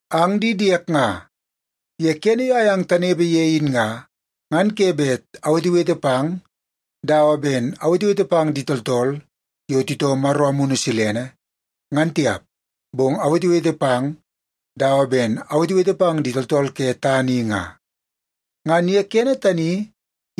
Ang di diek nga, ye kene yo ayang tanepe ye in nga, ngan ke bet awetewete pang dawa ben awetewete pang di tooltool yo titoo Maro Amunu Silene, ngan tiap, bong awetewete pang dawa ben awetewete pang di tooltool ke tana i nga. Ngan ye kene tani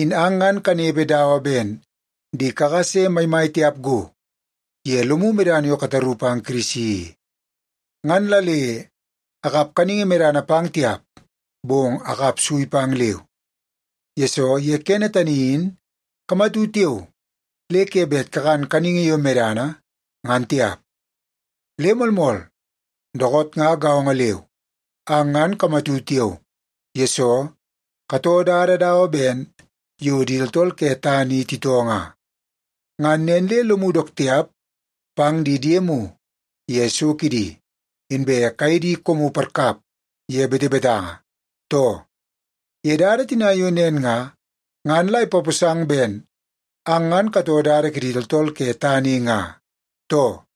in ang ngan kanepe dawa ben di kakase maimai tiap go ye lomu medana yo kataru pang Kirisi i. Ngan la le akap kaningi medana pang tiap, bong akap sui pang leu, yesoo ye kene tani in kamatu tiao le ke bet kakan kaningi yo medana, ngan tiap. Le moolmool, dookoot nga gaongo leu, ang ngan kamatu tiao, yesoo katoo dada dawa ben yo di tooltool ke tana i titoo nga. Ngan nen le lomu dook tiap pang di diemu ye so kidi, inbe kaye di koomu parkap ye betebetanga, too? Ye dada tina yo nen nga, ngan la ipaposang ben ang ngan katoo dada kidi tooltool ke tana i nga, too?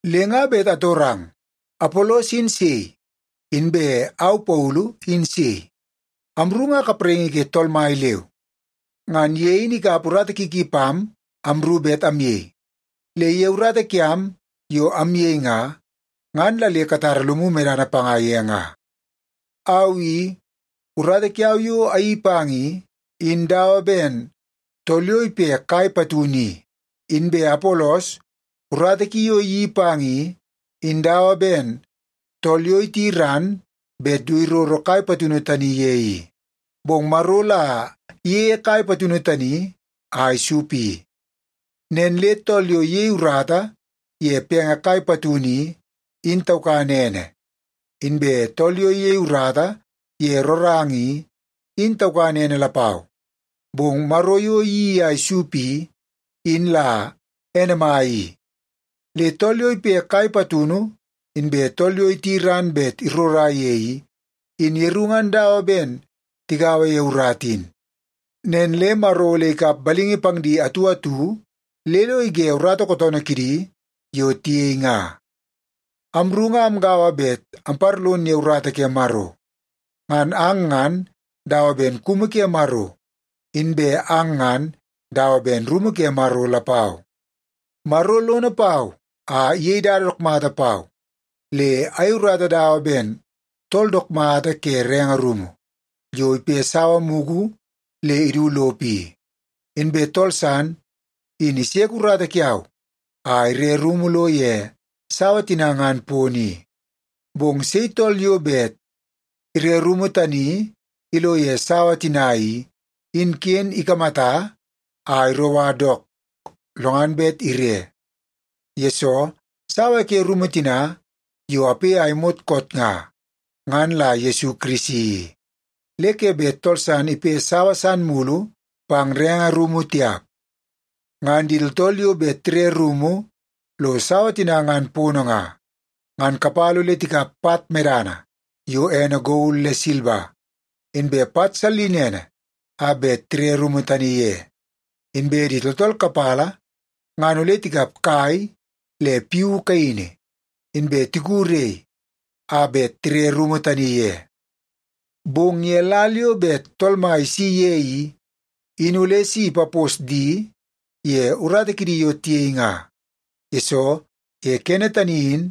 Le nga bet atorang, Apolos in sei? Inbe au Paulu in sei? Amru nga kapraingi ke Tool Mai leu. Ngan ye in ikap urata ki ki pam amru bet amyei. Le ye urata kiam yo amyei nga, ngan la le katara lomu medana panga ye nga. Au i, urata kiau yo ayeii pang i, in dawa ben tool yo ipe kai patunu i. Inbe Apolos, urata ki yo iyeii pang i, in dawa ben tool yo iti ran bet du iroro kai patunu tani ye i. Bong Maro la iyeie kai patunu tani a isup i. Nen le tool yo iyei urata ye penge kai patunu i, in taukan ene. Inbe tool yo iyei urata ye roranga i, in taukan ene lapau. Bong Maro yo iyeii a isup i, in la ene mai i. Le tool yo ipe kai patunu, inbe tool yo iti ran bet irora ye i, in yeru ngan dawa ben tigaua ye urata in. Nen le Maro ole ikap balingi pang di atu atu le lo ige urata kootoonoo kidi yo tiyei nga. Amru nga amgaua bet amparlon ye urata ke Maro. Ngan ang ngan dawa ben kumu ke Maro, inbe ang ngan dawa ben rumu ke Maro lapau. Maro lono pau a iyei dada dook mata pau le ayei urata dawa ben tool dook mata ke renge rumu yo ipe sawa mugu le idu lopo i. Inbe tool san in iseke urata kiau a ire rumu lo ye sawa tina ngan pono i. Bong sei tool yo bet ire rumu tani ilo ye sawa tina i, in ken ikamata a iroua dook lo ngan bet ire, yesoo sawa ke rumu tina yo ape a imot koot nga, ngan la Yesu Kirisi i. Le ke bet tool san ipe sawa san mulu pang renge rumu tiap. Ngan di tooltool yo bet tire rumu lo sawa tina ngan pono nga, ngan kapala ole tikap pat medana yo ene gol le silba, inbe pat sallinene a bet tire rumu tani ye. Inbe di tooltool kapala ngan ole tikap kai le piu kaini, inbe tiku rei a bet tire rumu tani ye. Bong ye lal yo bet Tool Mai isi ye i, in ole si ipapos di ye urata kidi yo tiyei nga. Yesoo, ye kene tani in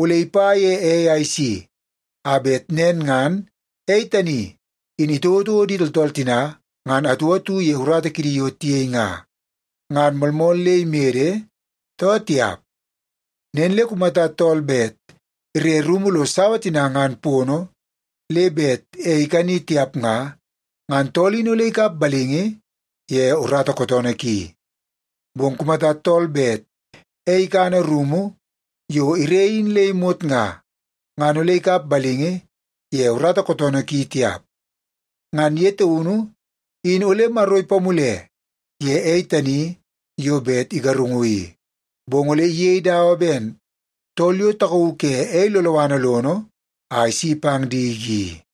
ole ipa ye ei a isi, a bet nen ngan ei tani in itouotouo di tooltool tina ngan atu atu ye urata kidi yo tiyei nga, ngan moolmool le imede, too tiap. Nen le kumata tool bet ire rumu lo sawa tina ngan pono le bet ei ikani tiap nga, ngan tool in ole ikap balingi ye urata kootoonoo ki. Bong kumata tool bet ei ikana rumu yo ire in le imot nga, ngan ole ikap balingi ye urata kootoonoo ki tiap. Ngan ye taunu in ole Maro ipamule ye ei tani yo bet igarungu i, bong ole iyei dawa ben tool yo takauu ke ei loloana lono a isi pang diki i.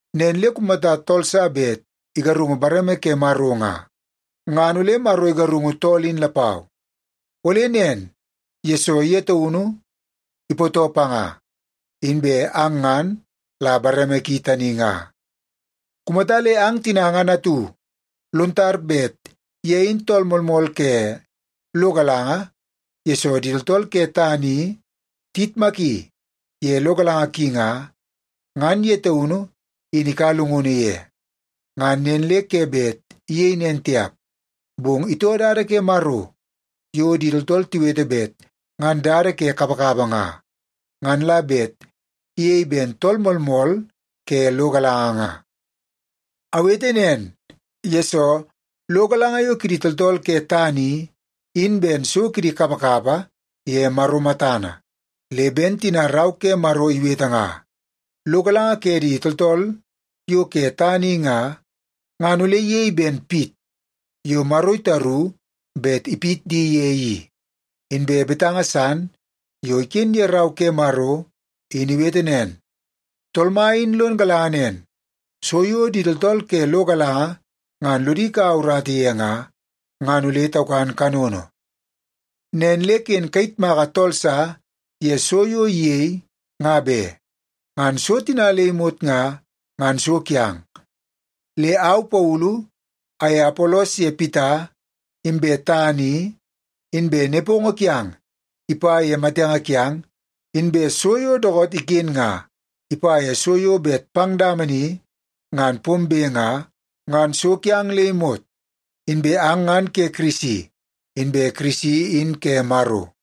Nen le kumata tool sa bet igarungu bareme ke Maro nga, ngan ole Maro igarungu tool in lapau. Ole nen, yesoo ye taunu ipootoo panga, inbe ang ngan la bareme ki tani nga. Kumata le ang tina ngan atu lon tar bet ye in tool moolmool ke lo galanga yesoo di tooltool ke tana i tiyitmaki ye lo galanga ki nga, ngan ye taunu in ikaua llungunu ye. Ngan nen le ke bet iyei nen tiap, bong itoo dada ke Maro yo di tooltool tiwete bet ngan dada ke kapakapa nga, ngan la bet iyei ben tool moolmool ke lo galanga nga. Awete nen, yesoo lo galanga yo kidi tooltool ke tana i, in ben so kidi kapakapa ye Maro matana. Le ben tina Rau ke Maro iwete nga, “Lo galanga ke di tooltool yo ke tana i nga, ngan ole iyei ben pit yo Maro itaru bet ipit di ye i.” Inbe betanga san yo iken ye Rau ke Maro in iwete nen, “Tool Mai in lon galanga nen, so yo di tooltool ke lo galanga ngan lodi kaua urata ye nga, ngan ole taukan kanono.” Nen le ken kayitmaka tool sa ye so yo iyei, nga be. Ngan so tina le imot nga, ngan so kiang. Le au Paulu aye Apolos ye Pita, inbe tana i, inbe nepongo kiang ipa ye matenge kiang, inbe so yo dookoot iken nga, ipa ye so yo bet pang dama ni ngan pombe nga, ngan so kiang le imot. Inbe ang ngan ke Kirisi, inbe Kirisi in ke Maro.